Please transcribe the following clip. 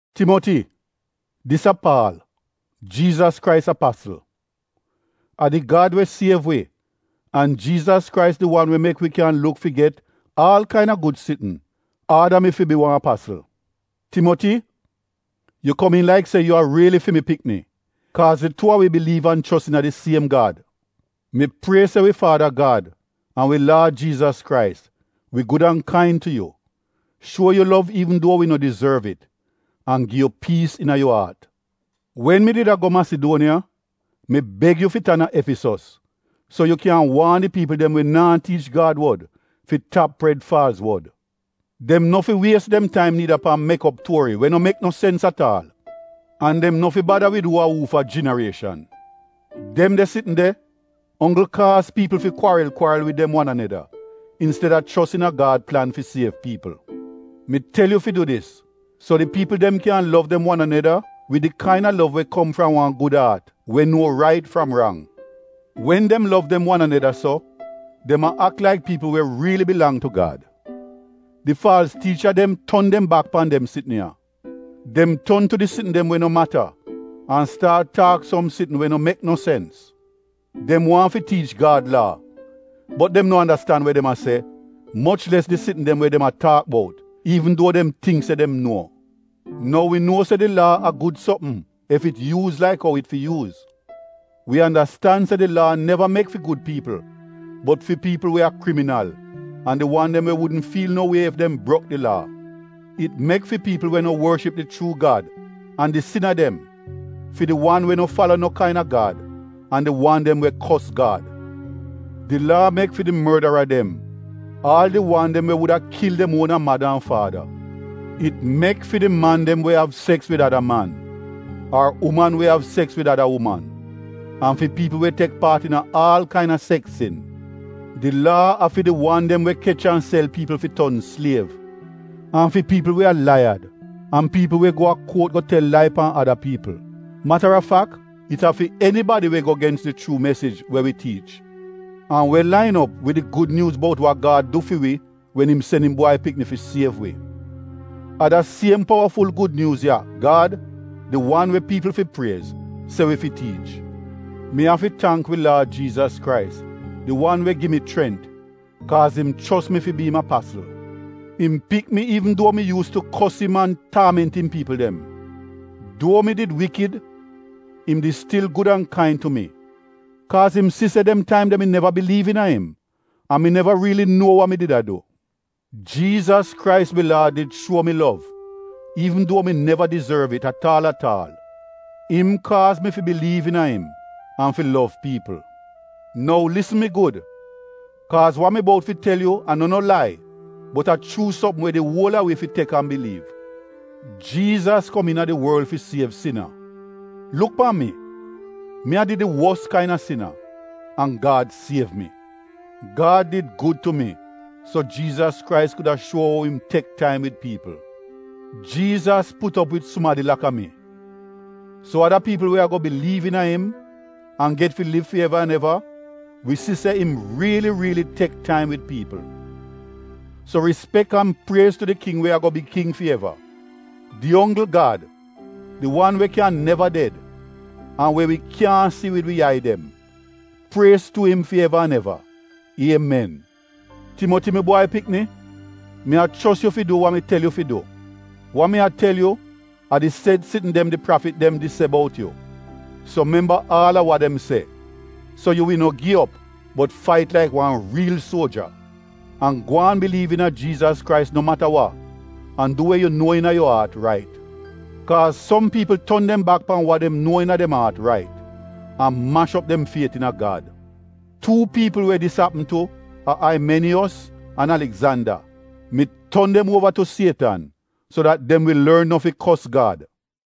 Timoti, dis a Paal, Jiizas Krais apasl. A di Gad we siev wi an Jiizas Krais di wan we mek wi ekspek gud sitn, aada mi fi bi wan apasl. Timoti, yu komiin laik se yu a riili fi mi pikni kaaz di tuu a wi biliiv an chos iina di siem Gad. Mi prie se wi faada Gad an wi Laad Jiizas Krais wi gud an kain tu yu, shuo yu lov iivn duo wi no dizorv it an gi yu piis iina yu aat. Wen mi did a go Masiduoniya, mi beg yu fi tan a Efisos so yu kyan waan di piipl dem we naa tiich Gad wod fi tap pred faalz wod. Dem no fi wies dem taim niida pan mek op tuori we no mek no sens at aal, an dem no fi bada wid uu a uufa jinarieshan. Dem de sitn de onggl kaaz piipl fi kwaril-kwaril wid dem wan aneda insteda chos iina Gad plan fi siev piipl. Mi tel yu fi du dis so di piipl dem kyan lov dem wan aneda wid di kaina lov we kom fram wan gud aat, we nuo rait fram rang. Wen dem lov dem wan aneda so, dem a ak laik piipl we riili bilang tu Gad. Di faalz tiicha dem ton dem bak pan dem sitn ya. Dem ton tu di sitn dem we no mata an staat taak som sitn we no mek no sens. Dem waahn fi tiich Gad Laa, bot dem no andastan we dem a se moch les di sitn dem we dem a taak bout, iivn duo dem tingk se dem nuo. Nou wi nuo se di Laa a gud sopm, ef it yuuz laik ou it fi yuuz. Wi andastan se di Laa neva mek fi gud piipl bot fi piipl we a kriminal an di wan dem we wudn fiil no wie ef dem brok di Laa. It mek fi piipl we no worship di chuu Gad an di sina dem, fi di wan we no fala no kaina gad an di wan dem we kos Gad. Di Laa mek fi di mordara dem aal di wan dem we wuda kil dem uona mada an faada. It mek fi di man dem we av seks wid ada man, ar uman we av seks wid ada uman, an fi piipl we tek paat iina aal kaina seks sin. Di Laa a fi di wan dem we kech an sel piipl fi ton sliev, an fi piipl we a laiyad an we gi faalz witnis. Mata a fak it a fi enibadi we go gens di chuu mesij we wi tiich, an we lain op wid di Gud Nyuuz bout wa Gad du fi wi wen im sen im Bwai Pikni fi siev wi. A da siem powaful Gud Nyuuz ya Gad, di wan we piipl fi priez, se mi fi tiich. Mi afi tangk wi Laad Jiizas Krais di wan we gi mi chrent kaaz im chos mi fi bi im apasl. Im pik mi iivn duo mi yuus tu kos im an taament im piipl dem. Duo mi did wikid, im di stil gud an kain tu mi kaaz im si se dem taim de mi neva biliiv iina im an mi neva riili nuo wa mi did a du. Jiizas Krais wi Laad did shuo mi lov iivn duo mi neva dizorv it at aal at aal. Im kaaz mi fi biliiv iina im an fi lov piipl. Nou lisn mi gud kaaz wa mi bout fi tel yu a no no lai bot a chuu sopm we di uol a wi fi tek an biliiv: Jiizas kom iina di worl fi siev sina. Luk pan mi, mi a did di wos kaina sina an Gad siev mi. Gad did gud tu mi so Jiizas Krais kuda shuo ou im tek taim wid piipl. Jiizas put op wid sumadi laka mi, so ada piipl we ago biliiv iina im an get fi liv fi eva an eva, wi si se im riili riili tek taim wid piipl. So rispek an priez tu di King we ago bi king fi eva, di onggl Gad, di wan we kyan neva ded an we wi kyaahn si wid wi yai dem, priez tu im fi eva an eva, Iemen! Timoti, mi bwai pikni, mi a chos yu fi du wa mi tel yu fi du. Wa mi a tel yu a di sed sitn dem di prafit dem di se bout yu. So memba aal a wa dem se, so yu wi no gi op bot fait laik wan riil suoja, an gwaan biliiv iina Jiizas Krais no mata wa an du we yu nuo iina yu aat rait. Kaaz som piipl ton dem bak pan wa dem nuo iina dem aat rait, an mash op dem fiet iina Gad. Tuu piipl we dis apm tu a Aimeniyos an Aligzanda. Mi ton dem uova tu Sietan so dat dem wi lorn no fi kos Gad.